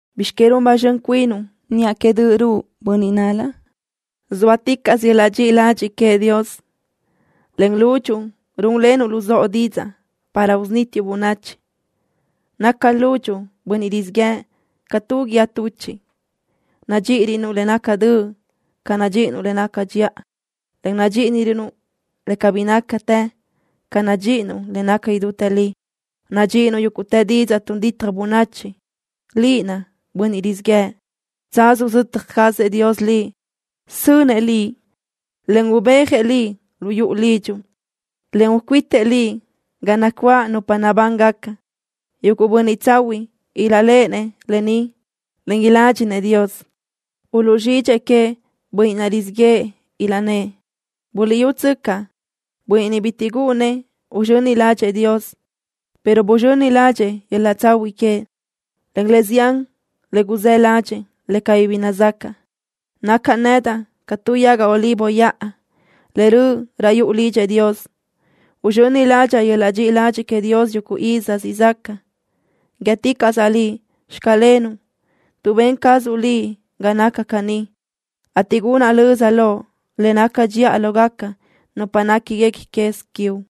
¿Bizx que run ba zxön cuinuʼ niʼa que döʼ ruʼu, bönniʼ nál-la? Zóaticaʼsö yöl-laʼ dxiʼi ladxiʼ queëʼ Dios. Len lúdxuʼu rúnlenuʼ luzóʼo didzaʼ para usunítiuʼ bönachi. Naca lúdxuʼu, bönniʼ rizíʼ yëʼ, ca tu guíë tuchiʼ. Nadxíʼirönuʼ le naca döʼ ca nadxíʼinuʼ le naca dxiʼa, en nadxíʼirönuʼ le cabí nácatë ca nadxíʼinuʼ le naca idútë li. Nadxíʼinuʼ yúguʼtë didzaʼ tun ditaj bönachi, liʼ naʼ, bönniʼ rizíʼ yëʼë. Tsaz uzötaj cazëʼ Dios liʼ. Sönëʼ liʼ, en ubéajëʼ liʼ lu yuʼu lidxuʼ, en ucuítëʼ liʼ ga nacuáʼ nupa nabángaca. Yuguʼ bönniʼ tsahuiʼ ilaʼléʼenëʼ lë ni, en iládxinëʼ Dios. Uluʼzxidxëʼ queëʼ bönniʼ naʼ rizíʼ yëʼë, ilaʼnë́ʼ: “¡Buliʼyútsöcaʼ! Bönniʼ ni bitiʼ gúʼunnëʼ uzxöni ládxëʼë Dios, pero buzxöni ládxëʼë yöl-laʼ tsahuiʼ queëʼ, en le zián le guzë́ ládxëʼë le cabí bi nazacaʼ.” Nacaʼ nedaʼ ca tu yaga olivo yaʼa le röʼ raʼ yuʼu lidxëʼ Dios. Uzxöni ládxaʼa yöl-laʼ dxiʼi ladxiʼ queëʼ Dios yuguʼ iz siʼ zaca. Guíëticaʼsaʼ Liʼ: “Xclenuʼ” tuʼ ben cazuʼ Liʼ ga naca caní, ateʼ gunaʼ löza Loʼ le naca dxiʼa lógaca nupa néquiguequi quez quiuʼ.